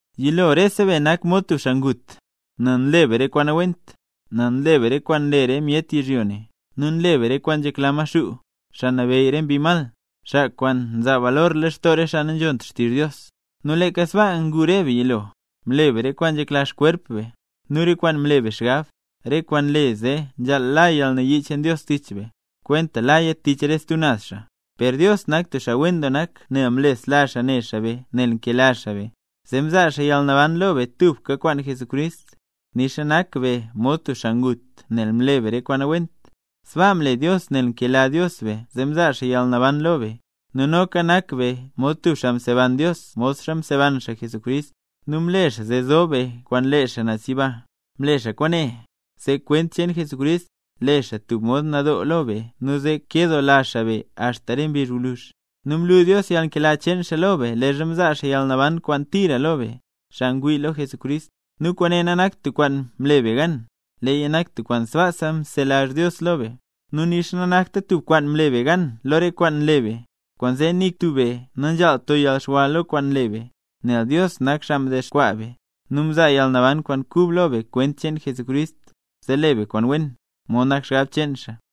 Yilo rese be nak mod tub xaa ngut, nel nle be re kwaan nawent, nel nle be re kwaan nle re myet yizhyo ne, nu nle be re kwaan nzhekla Maxuu, xaa nabeyy re mbi mal, xaa kwaan nzaa balor lextoo re xaa nanzhont xtizh Dios. Nu leeka sbaa ngu re be yilo, mle be re kwaan nzhekla xkwerp be, nu re kwaan mle be xgab, re kwaan nle zee nzhaal la yalnayii cheen Dios tich be, kwenta laya tich re stub naz xaa. Per Dios nak tub xaa wen doo nak nu mlesla xaa ne xaa be nel nkela xaa be, zee mzaa xaa yalnaban lo be tubka kwaan Jesucrist, nixa nak be mod tub xaa ngut nel mle be re kwaan nawent. Sbaa mle Dios nel nkela Dios be zee mzaa xaa yalnaban lo be. Nu noka nak be mod tub xaa mseban Dios modxa mseban xaa Jesucrist, nu mle xaa zee zob be kwaan lee xaa naz yiba. Mle xaa kwaane, zee kwent cheen Jesucrist, le xaa tub mod nadoo lo be nu zee kedoola xaa be axta re mbizh gwluzh. Nu mlu Dios yalnkela cheen xaa lo be leezha mzaa xaa yalnaban kwaan tira lo be, xaa ngwii lo Jesucrist. Nu kwaane nanakt tub kwaan mle be gan, leeya nak tub kwaan sbaasa mzelazh Dios lo be. Nu nixa nanakta tub kwaan mle be gan lo re kwaan nle be, kwaanzee nik tub be nanzhaalt to yalxwa lo kwaan nle be. Nel Dios nak xaa mdexkwaa be, nu mzaa yalnaban kwaan kub lo be kwent cheen Jesucrist, zee le be kwaan wen, mod nak xgab cheen xaa.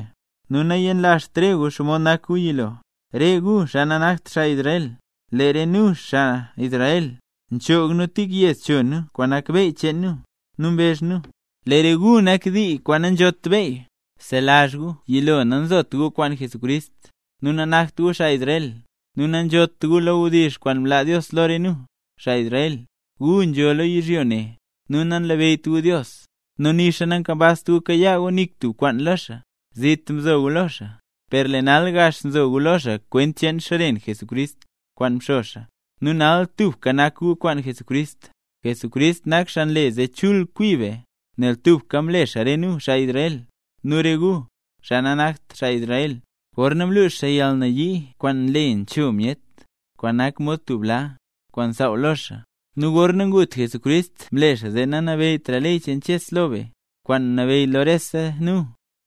Nu nayenlazht re gu xomod nak gu yilo, re gu xaa nanakt xaa Israel. Lee re nu, xaa Israel, nchoog nu tik yed cho nu kwaan nak beyy cheen nu, nu mbezh nu: “Lee re gu nak dii nanzhot beyy”. Bzelazh gu yilo nanzot gu kwaan Jesucrist, nu nanakt gu xaa Israel, nu nanzhot gu lo wdizh kwaan mlaa Dios lo re nu, xaa Israel, gu nzho lo yizhyo ne, nu nanlabeyyt gu Dios, nu nixa nankambazt gu kayaa gu nik tub kwaan lo xaa. Zit mzo gu lo xaa. Per lee nal gax nzo gu lo xaa kwent cheen xren Jesucrist, kwaan mxo xaa; nu nal tubka nak gu kwaan Jesucrist. Jesucrist nak xaa nle zee chul kwi be, nel tubka mle xaa re nu, xaa Israel, nu re gu, xaa nanakt xaa Israel, gorna mlux xaa yalnayii kwaan nle nrexcho myet, kwaan nak mod tub bla, kwaan nsaaw lo xaa. Nu gorna ngut Jesucrist mle xaa zee nanabeyytra ley cheen Ches lo be, kwaan mnabeyy lo rese nu,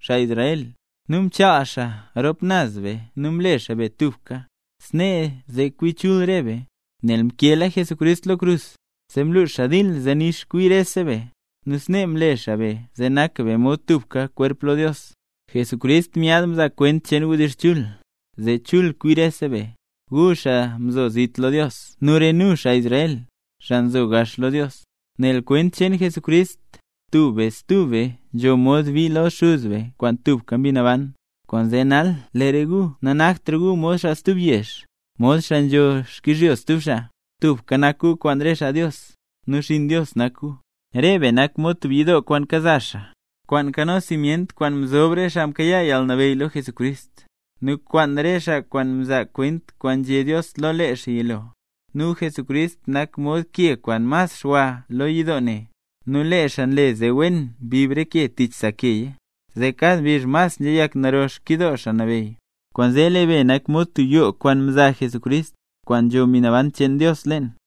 xaa Israel, nu mchaal xaa rop naz be nu mle xaa be tubka, snee zee kwi chul re be. Nel mkeela Jesucrist lo krus, zee mluux xaa dil zee nix kwi rese be, nu snee mle xaa be zee nak be mod tubka kwerp lo Dios. Jesucrist myaad mzaa kwent cheen wdizh chul, zee chul kwi rese be, gu xaa mzo zit lo Dios nu re nu, xaa Israel, xaa nzo gax lo Dios. Nel kwent cheen Jesucrist, tub be stub be nzho mod bii lo Xuz be kwaan tubka Mbi Naban. Kwaanzee nal, lee re gu nanaktra gu mod xaa stub yezh, mod xaa nzho xkyizhyo stub xaa, tubka nak gu kwaan re xaa mle nambey Jesús, nu xinn Dios nak gu. Re be nak mod tub yidoo kwaan kaza xaa, kwaan nkano simyent kwaan mzob re xaa mkayaa yalnabeyy lo Jesucrist, nu kwaan re xaa kwaan mzaa kwent kwaan nzhé Dios lo lee xaa yilo, nu Jesucrist nak mod ke kwaan mas xwa lo yidoo ne. Nu lee xaa nle zee wen wen mbib re ke tich sa keya, zee kad mbizh mas nzheyak naro xkyidoo Xaa Nabeyy. Kwaanzee lee be nak mod tub yoo kwaan mza Jesucrist, kwaan nzho Mbi Naban cheen Dios leen.